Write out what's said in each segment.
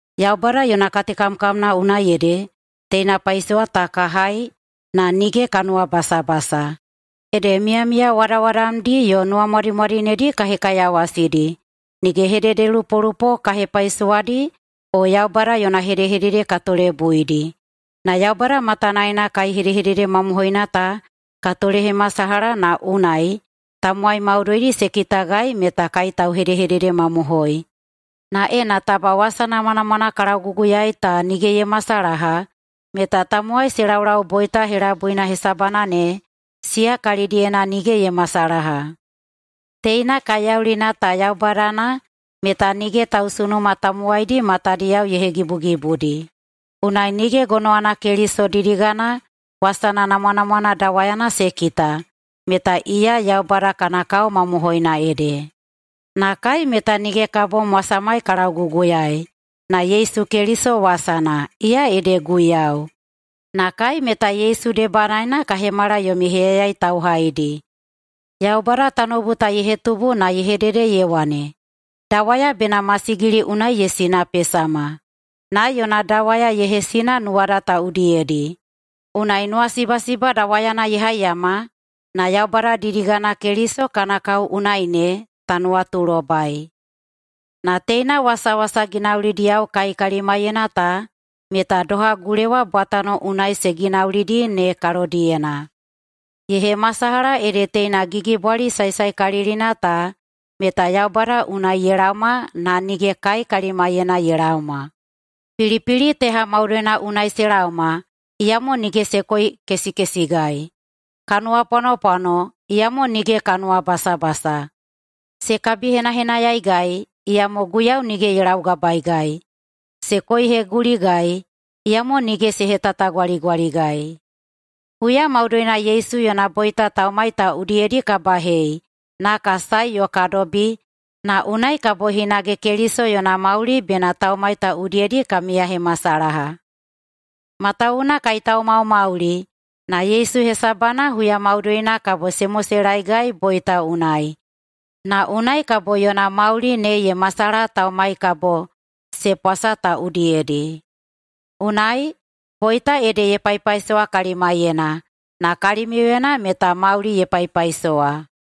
Yaubada yona katekamkamna unai ede teina paisowa ta ka hai na nige ka nuwabasabasa. Ede miyamiya wadawadamdi yo nuwamwadimwadinedi ka hekaiyawasidi, nige hededelupolupo ka hepaisowadi o Yaubada yona hedehedede ka tolebuidi. Na Yaubada matanaena kai hedehedede mamohoina ta ka tolehemasalaha na unai tamowai maudoidi se kitagai meta kai tauhedehededemamohoi. Na ena taba wasa namwanamwana ka lauguguyaei ta nige ye masalaha meta tamowai se laulau boita helabuina hesabana ne, siya kalidiyena nige ye masalaha. Teina kaiyaulina ta yaubadana meta nige tausunuma tamowaidi matadiyao ye hegibugibudi, unai nige gonowana Keliso didigana wasana namwanamwana dawayana se kita, meta iya Yaubada kana kao mamohoina ede. Na kai meta nige ka bom wasamai ka lauguguyaei, na Yesu Keliso wasana, iya ede Guiyau. Na kai meta Yesu debanaena ka hemala yomi heyayai tauhaidi. Yaubada tanoubu ta ye hetubu na ye hedede ye wane, “Dawaya bena masigili unai ye sinapesama”, na yona dawaya ye hesina nuwada ta udiyedi. Unai nuwasibasiba dawayana ye haiyama na Yaubada didigana Keliso kana kao unai ne ta nuwatulobai. Na teina wasawasa ginaulidiyao kai kalimaiyena ta meta doha gulewa bwatano unai se ginaulidi ne kalodiyena. Ye hemasalaha ede teina gigibwali saesaekalilina ta meta Yaubada unai ye laoma na nige kai kalimaiyena ye laoma. Pilipili teha maudoina unai se laoma, iyamo nige se koikesikesigai. Ka nuwapwanopwano, iyamo nige ka nuwabasabasa. Se kabihenahenayaigai, iyamo Guiyau nige ye laugabaeigai. Se koiheguligai, iyamo nige se hetatagwaligwaligai. Huya maudoina Yesu yona boita taumai ta udiyedi ka bahei na ka sae yo ka dobi, na unai kabo hinage Keliso yona mauli bena taumai ta udiyedi ka miyahemasalaha. Matawuwuna kai taumaumauli na Yesu hesabana huya maudoina kabo se moselaegai boita unai, na unai kabo yona mauli ne ye masalaha taumai kabo se pwasa ta udiyedi. Unai, boita ede ye paipaisowa kalimaiyena, na kalimiuyena meta mauli ye paipaisowa.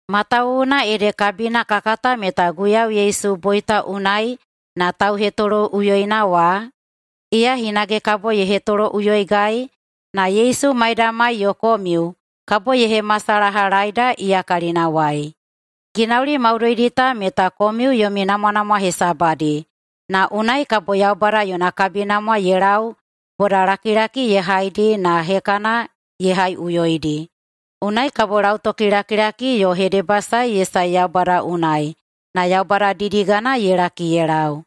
Matawuwuna ede kabina ka kata meta Guiyau Yesu boita unai na tauhetoloꞌuyoina wa, iya hinage kabo ye hetoloꞌuyoigai na Yesu maidamai yo komiu kabo ye hemasalahalaeida iya kalinawai. Ginauli maudoidi ta meta komiu yomi namwanamwa hesabadi, na unai kabo Yaubada yona kabinamwa ye lau bodalakilaki ye haidi na hekana ye haiꞌuyoidi. Unai kabo lautokilakilaki yo hedebasae ye sae Yaubada unai, na Yaubada didigana ye laki ye lau.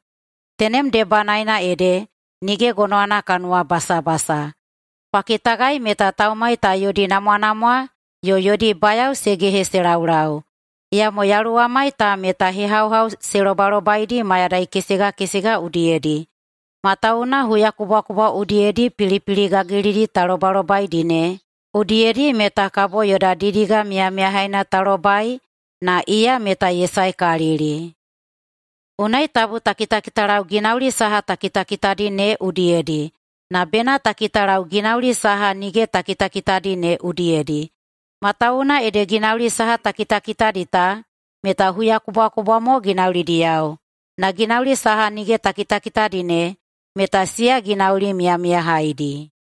Tenem debanaena ede nige gonowana ka nuwabasabasa. Kwa kitagai meta taumai ta yodi namwanamwa yo yodi bayao se gehe se laulau, iyamo yaluwamai ta meta hehauhau se lobalobaidi mayadai kesega kesega udiyedi. Matawuwuna huyakubwakubwa udiyedi pilipili gagilidi ta lobalobaidi ne udiyedi meta kabo yoda didiga miyamiyahaina ta lobai na iya meta ye saekalili. Unai tabu ta kitakitalau ginauli saha ta kitakitadi ne udiyedi na bena ta kitalau ginauli saha nige ta kitakitadi ne udiyedi. Matawuwuna ede ginauli saha ta kitakitadi ta meta huyakubwakubwa mo ginaulidiyao, na ginauli saha nige ta kitakitadi ne meta siya ginauli miyamiyahaidi.